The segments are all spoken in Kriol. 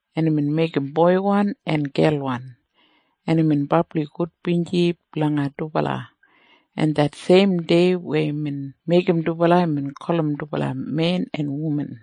Imbin meigim boiwan en gelwan, en imbin brabli gudbinji blanga dubala, en det seim dei weya imbin meigim dubala, imbin gulum dubala men en wuman.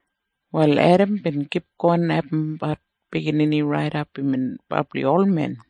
Wal Edam bin kipgon abumbat biginini raidap imbin brabli olmen,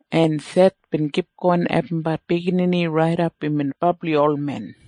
en Seth bin kipgon abumbat biginini raidap imbin brabli olmen,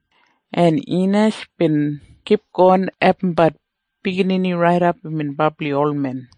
en Inash bin kipgon abumbat biginini raidap imbin brabli olmen,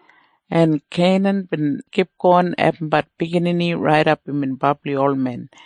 en Kenan bin kipgon abumbat biginini raidap imbin brabli olmen,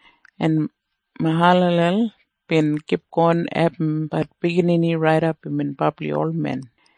en Mahalalel bin kipgon abumbat biginini raidap imbin brabli olmen,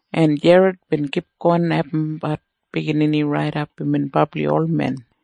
en Jered bin kipgon abumbat biginini raidap imbin brabli olmen,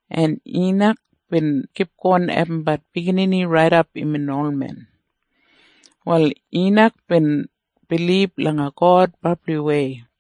en Inak bin kipgon abumbat biginini raidap imbin olmen. Wal Inak bin bilib langa God brabliwei,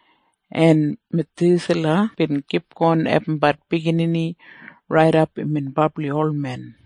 en Mathusala bin kipgon abumbat biginini raidap imbin brabli olmen,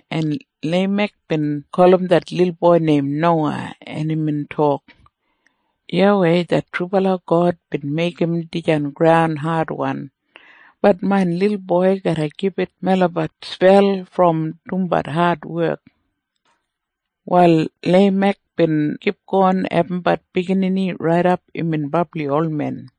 en Leimek bin gulum det lilboi neim Nowa, en imbin tok, “YAWEI det trubala God bin meigim dijan graun adwan. Bat main lilboi garra gibit melabat spel brom dumbat adwek.” Wal Leimek bin kipgon abumbat biginini raidap imbin brabli olmen,